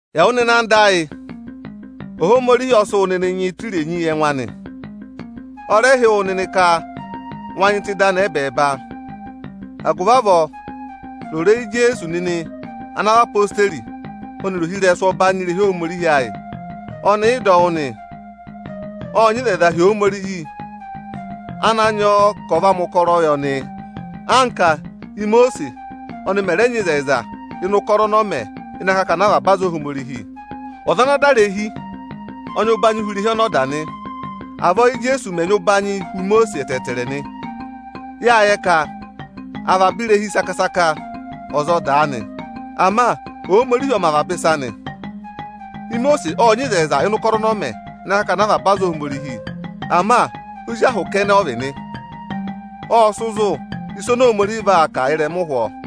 Ẹwụ nịnị anda ayị, Ohomorihi ọ sị wụ nịnị nyị tụ́ irenyi yị ẹngụ anị. Ọ rẹ hị́ wụ nịnị ka wa nyị tụ́ ịdị anị ẹbẹẹba. Agụvị avọọ ro ịrẹyị Ijeesu nịnị ana vị odeyi ọnịrị ohirẹsụ ọbanyị irehi Ohomorihi ayị. Ọnị ị dọ wụ́ nị. Ộ nyị ịzẹyịza hi Ohomorihi ana nyị ọ ka ọ̀ va mẹ̀ ụkọrọ yị ọnị, anka Imosiisi ọnị mẹ̀ rẹ nyị ịzẹyịza ịnị ụkọrọ ọnị ọ mẹ ịnị akakana avaba aza Ohomorihi. Ọza ana da irehi ọ nyị ụbanyị huni irehi ọnị ọ dà nị. Avọọ Íjeesu mẹ̀ nyị ụbanyị huni Imosiisi ẹtẹẹtẹrẹ nị. Yáa yẹ ka avaba irehi saka-saka ọza ọ dàa nị. Ama Ohomorihi ọ mẹ avaba ịsa nị. Imosiisi ộ nyị ịzẹyịza ịnị ụkọrọ ọnị ọ mẹ ịnị akakana avaba aza Ohomorihi. Ama ozi ahụ kẹnẹ ọ vị nị. Ộ sị zụ̀ ịsị Ohomorihi vaa kà ị́rẹma ụhwọọ.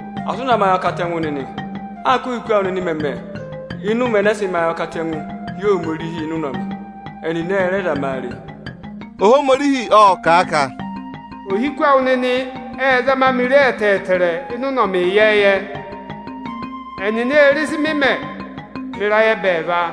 asị ụ na mẹ ayọkatẹngụ nịnị anka óhiku awụ nịnị mẹ̀ mẹ ịnị ụmẹ ẹnẹ ẹ sị mẹ akamawụ hi Ohomorihi ịnị ụnọmị. Ẹnịnị ẹ rẹ zama a re. Ohomorihi ọ̀ kà a ka: Ohiku awụ nịnị ệ zama ọnị re ẹtẹẹtẹrẹ ịnị ụnọmị ịyẹẹyẹ, ẹnịnị ê re ịsị ọnị mẹ mẹ ịrayị ẹbẹẹva.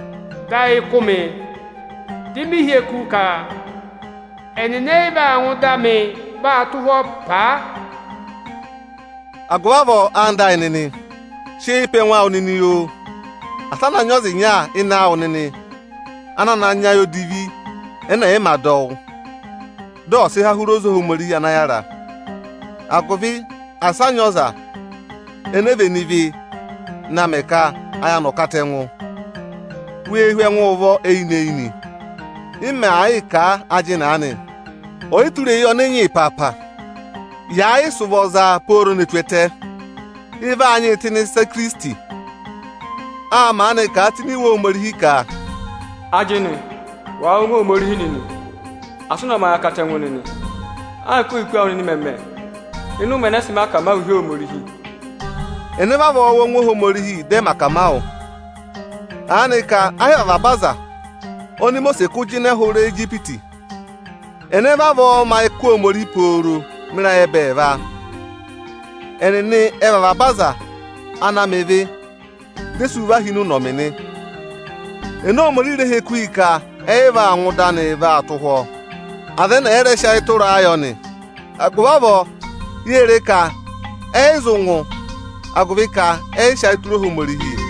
Dị ayị kụ́ ọnị, dị ọnị hị́ eku ka ẹ yị vaa ngụ ịdị anịị tụ́ ụhwọ́ paa nị. Agụvị avọọ, anda ayị nịnị, sị eyi pe ẹngụ awụ nịnị oo. Asị a na nyị ọza ịnya ịnị awụ nịnị ana na nyị ayị odivi ẹnẹ ẹ̀ yị ma dọ wụ́, dị ọ sị há hụrị oze Ohomorihi ana yára. Agụvị asị a nyị ọza ene vene ịvị na mẹ ka ayị anị ọ̀ katẹngụ, wee hú ẹngụ ụvọ nịnị eyinị-eyinị m màa yịị kà a ajịnị aanị. Oyitureyi ọnị ị nyị ịpaapa, yàa yị sị ụvọ zaa pooro ne tù ẹtẹ, ị vaa nyịị tụ́ ịnị ịsa Ikirisiti. Â maanị kà a tụ́ ini Iwe Ohomorihi ka: Ajịnị, wàa wụ́ ọngwẹ Ohomorihi nịnị, asị ụ na mẹ ayọkatẹngụ nịnị, anka ohiku awụ nịnị mẹ̀ mẹ ịnị ụmẹ ẹnẹ ẹ sị mẹ akamawụ hi Ohomorihi. Ẹnẹ vavọọ wụ́ ọngwẹ Ohomorihi dị ẹ mẹ akamawụ? Aanị ka ẹ yị vị aza oni Imosiisi kụ́ jịnẹ hụrị Ijipiti? Ẹnẹ vavọọ mẹ ayị kụ́ Ohomorihi pooro mẹ ịrayị ẹbẹẹva? Ẹnịnị ẹ vị avaba aza ana mẹ ịvị, di e sú hi ịnị ụnọmị nị. Ene Ohomorihi rẹ hị́ eku ka ẹ yị vaa ngụ ịdị anị vaa tụ́? Aza ẹnẹ ẹ̀ yị rẹ sị ayị tụraa yọ nị. Agụvị avọọ, yée re ka ẹnịnị ẹ yị zụ ngụ, agụvị ka ẹnịnị ẹ yị sị ayị tụra Ohomorihi.